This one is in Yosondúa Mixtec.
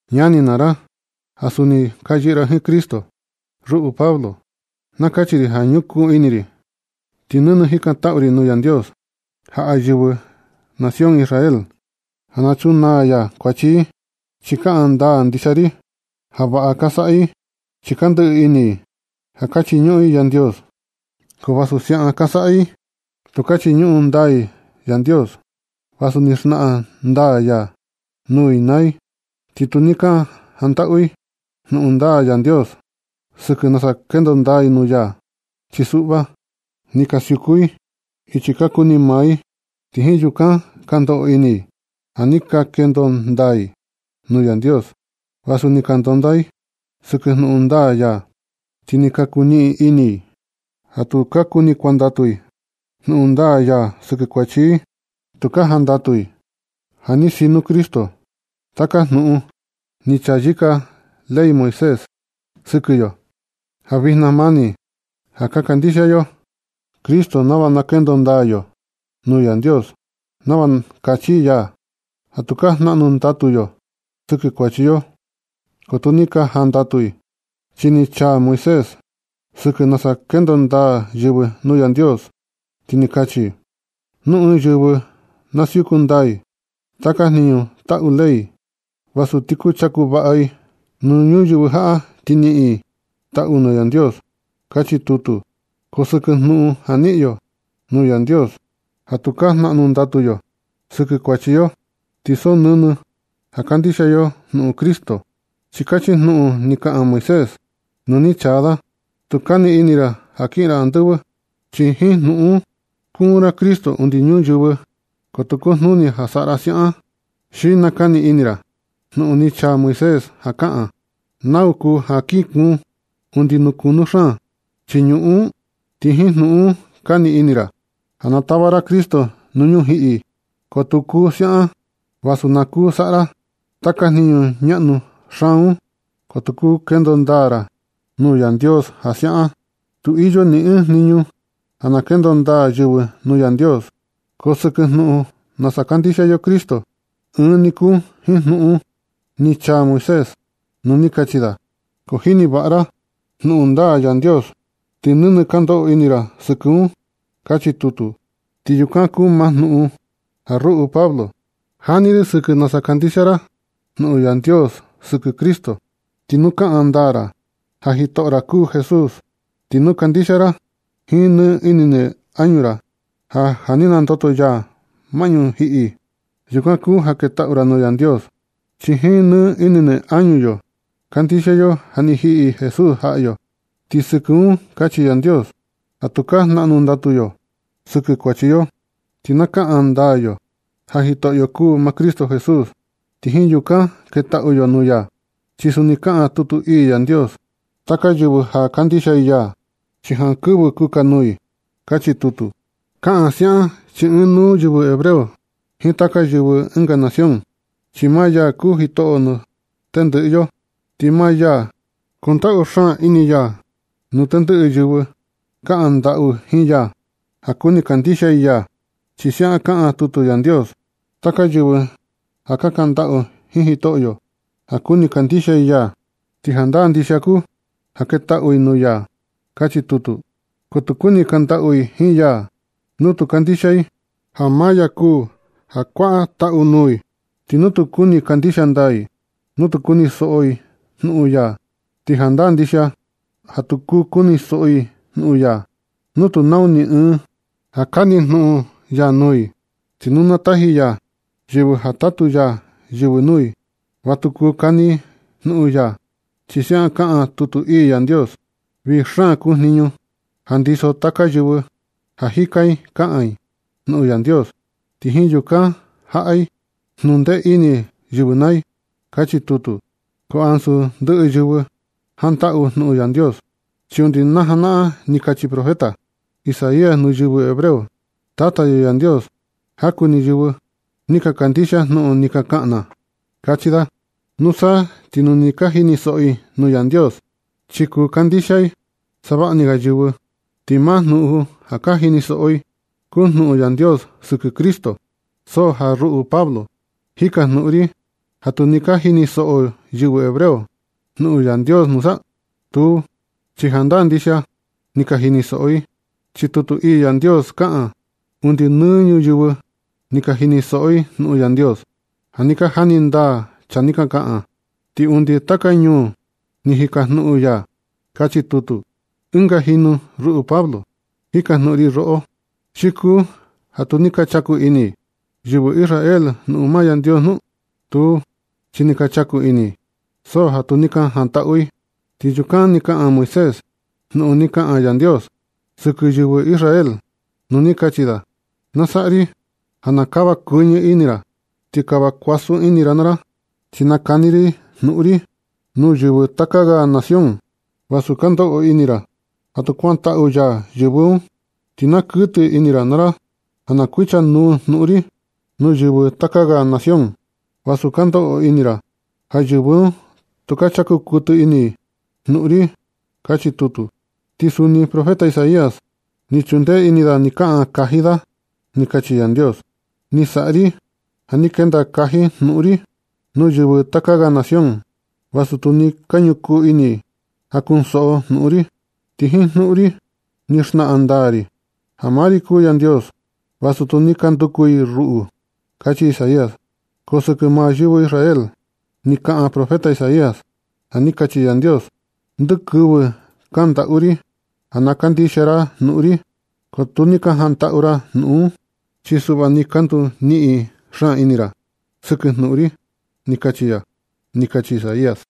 Ñani naa ra ja suni ka yɨꞌɨ ra jiin Cristo, ruꞌu Pablo, na kachi ri ja ñukuu ini ri ti nɨnɨ jikantaꞌu ri nuu Yandios jaꞌa yɨvɨ nación yo Israel, ja na chunaa ya i. Chi kaꞌan ndaa ndixia ri ja vaꞌa ka saꞌa i chi ka ndɨꞌɨ ini i ja ka chiñuꞌun i Yandios. Ko vasu siaꞌan ka saꞌa i, tu ka chiñuꞌun ndaa i Yandios vasu ni xnaꞌan ndaa ya nuu i naa i. Ti tu ni ka jantaꞌu i jnuꞌun ndaa Yandios sɨkɨ nasa kendo ndaa i nuu ya. Chi suꞌva, ni ka siuku i ichi ka kuni maa i, ti jiin yukan ka ndoꞌo ini i ja ni ka kendo ndaa i nuu Yandios, vasu ni ka ndonda i sɨkɨ jnuꞌun ndaa ya. Ti ni ka kuniꞌin ini i ja tu ka kuni kuantaꞌu i jnuꞌun ndaa ya sɨkɨ kuachi i. Tu ka jantaꞌu i ja ni sino Cristo taka jnuꞌun ni chayɨka ley Moisés sɨkɨ yo, ja vijna mani ja kandixia yo Cristo nava na kendo ndaa yo nuu Yandios, nava na kachi ya ja tukaa jnaꞌnu ndatu yo sɨkɨ kuachi yo. Ko tu ni ka jantaꞌu i. Chi ni chaa Moisés sɨkɨ nasa kendo ndaa yɨvɨ nuu Yandios, ti ni kachi: “Nu ɨɨn yɨvɨ na siuku ndaa i taka jniñu taꞌu ley, nusa ti kuchaku vaꞌa i nuu ñuyɨvɨ jaꞌa ti niꞌin i taꞌu nuu Yandios”, kachi tutu. Ko sɨkɨ jnuꞌun ja niꞌin yo nuu Yandios ja tukaa jnaꞌnu ndatu yo sɨkɨ kuachi yo, ti so nɨnɨ ja kandixia yo jnuꞌun Cristo, chi kachi jnuꞌun ni kaꞌan Moisés nu ni chaa da: “Tu kani ini ra ja kiꞌin ra andɨvɨ”, chi jiin jnuꞌun un skuun ra Cristo undi ñuyɨvɨ, ko tu kojnuni ja saꞌa ra siaꞌan. Xi nakani ini ra jnuꞌun ni chaa Moisés ja kaꞌan: “¿Nau kuu ja kinkuun undi nuu kunu xaan chii ñuꞌun un?” Ti jiin jnuꞌun un kani ini ra ja na tava ra Cristo nuu ñujiꞌi, ko tu kuu ja siaꞌan. Vasu na kuu saꞌa ra taka jniñu ñaꞌnu xaan un, ko tu kuu kendo ndaa ra nuu Yandios ja siaꞌan. Tu iyo ni ɨɨn jniñu ja kendo ndaa yɨvɨ nuu Yandios. Ko jnuꞌun sɨkɨ nasa kandixia yo Cristo, ɨɨn ni kuu jiin jnuꞌun ni chaa Moisés nu ni kachi da: “Ko jini vaꞌa ra jnuꞌun ndaa Yandios ti nɨnɨ ndoꞌo ini ra sɨkɨ un”, kachi tutu. Ti yukan kuu maa jnuꞌun ja ruꞌu Pablo, jani ri sɨkɨ nasa kandixia ra jnuꞌun Yandios sɨkɨ Cristo. Ti nu kaꞌan ndaa ra ja jitoꞌo ra kuu Jesús, ti nu kandixia ra jiin nɨ ini nɨ añu ra ja ja ni nandoto ya maꞌñu ñujiꞌi, yukan kuu ja ketaꞌu ra nuu Yandios. Chi jiin nɨ ini nɨ añu yo kandixia yo ja ni jiꞌi Jesús jaꞌa yo, ti sɨkɨ un kachi Yandios ja tukaa jnaꞌnu ndatu yo sɨkɨ kuachi yo. Ti ka kaꞌan ndaa yo ja Jitoꞌyo kuu maa Cristo Jesús, ti jiin yukan ketaꞌu yo nuu ya. Chi suni kaꞌan tutu ii Yandios: “Taka yɨvɨ ja kandixia i ya, chi jankɨvɨ kukanuu i”, kachi tutu. Kaꞌan siaꞌan chi ɨɨn nuu yɨvɨ hebreo jiin taka yɨvɨ ɨnga nación. Chi maa ya kuu jitoꞌo nuu tendɨꞌɨ yo, ti maa ya kundaꞌu xaan ini ya nuu tendɨꞌɨ yɨvɨ kaꞌan ndaꞌu jiin ya ja kuni kandixia i ya. Chi siaꞌan kaꞌan tutu Yandios: “Taka yɨvɨ ja kaꞌan ndaꞌu jiin Jitoꞌyo ja kuni kandixia i ya, ti jandaa ndixia kuu ja na ketaꞌu i nuu ya”, kachi tutu. Ko tu kuni kandaꞌu i jiin ya nu tu kandixia i ja maa ya kuu ja kuaꞌa taꞌu nuu i. Ni tu kuni kandixia ndaa i nu tu kunisoꞌo i jnuꞌun ya. Ti jandaa ndixia ja tu kunisoꞌo i jnuꞌun ya nu tu nau ɨɨn ja kani jnuꞌun ya nuu i. Ti nu tu taji ya yɨvɨ ja tatu ya jniñu nuu i, va tu kuu kani i jnuꞌun ya, chi siaꞌan kaꞌan tutu ii Yandios: “Vii xaan kuu jniñu ja ndiso taka yɨvɨ ja jika i kaꞌan i jnuꞌun Yandios, ti jiin yukan jaꞌa i jnundee ini yɨvɨ naa i”, kachi tutu. So ja ansu ndɨꞌɨ yɨvɨ jantaꞌu jnuꞌun Yandios, chi undi na janaꞌan kachi profeta Isaías nuu yɨvɨ hebreo: “Tata yo Yandios, jaku ni yɨvɨ ni kandixia jnuꞌun ni ka kaꞌan na”, kachi da. Nusa ti nu ka jinisoꞌo i jnuꞌun Yandios, chi kuu kandixia savaꞌni ga yɨvɨ. Ti maa jnuꞌun ja ka jinisoꞌo i kuu jnuꞌun Yandios sɨkɨ Cristo. So ja ruꞌu Pablo, jikajnuꞌun ri: ¿Ja tu ni ka jinisoꞌo yɨvɨ hebreo jnuꞌun Yandios nusa? Tuu, chi jandaa ndixia ni ka jinisoꞌo i, chi tutu ii Yandios kaꞌan: Undi nɨ ñuyɨvɨ ni ka jinisoꞌo i jnuꞌun Yandios ja ni ka jani ndaa chaa ni ka kaꞌan. Ti undi nuu taka ñuu ni jikajnuꞌun ya. Kachi tutu. Ɨnga jinu ruꞌu Pablo, jikajnuꞌun ri roꞌo, ¿xi kuu ja tu ni ka chaku ini i yɨvɨ Israel maa jnuꞌun Yandios nu? Tuu, chi ni ka chaku ini i so ja tu ni ka jantaꞌu i. Ti yukan ni kaꞌan Moisés jnuꞌun ni kaꞌan Yandios sɨkɨ yɨvɨ Israel nu ni kachi da: Na saꞌa ri ja na kava kuɨñɨ ini ra ti kava kuasun ini ra naa ra, chi na kani ri jnuꞌun ri nuu yɨvɨ taka ga nación, vasu ka ndoꞌo ini ra ja tu kuantaꞌu ya yɨvɨ un. Ti na kuɨtɨ ini ra naa ra ja na kuicha nuu jnuꞌun ri nuu yɨvɨ taka ga nación, vasu ka ndoꞌo ini ra ja yɨvɨ un tu ka chaku kuɨtɨ ini i jnuꞌun ri. Kachi tutu. Ti suni profeta Isaías ni chundee ini da ni kaꞌan kaji da ja ni kachi Yandios: Ni saꞌa ri ja ni kenda kaji jnuꞌun ri nuu yɨvɨ taka ga nación, vasu tu ni ka ñukuu ini i ja kunsoꞌo i jnuꞌun ri. Ti jiin jnuꞌun ri ni xnaꞌan ndaa ri nuu i ja maa ri kuu Yandios, vasu tu ni ka nanduku i ruꞌu. Kachi Isaías. Ko sɨkɨ maa yɨvɨ Israel, ni kaꞌan profeta Isaías ja ni kachi Yandios: Ndɨkɨvɨ kandaꞌu ri ja na kandixia ra jnuꞌun ri, ko tu ni ka jantaꞌu ra jnuꞌun un. Chi suꞌva ni ka nduniꞌin xaan ini ra sɨkɨ jnuꞌun ri. Ni kachi ya, ni kachi Isaías.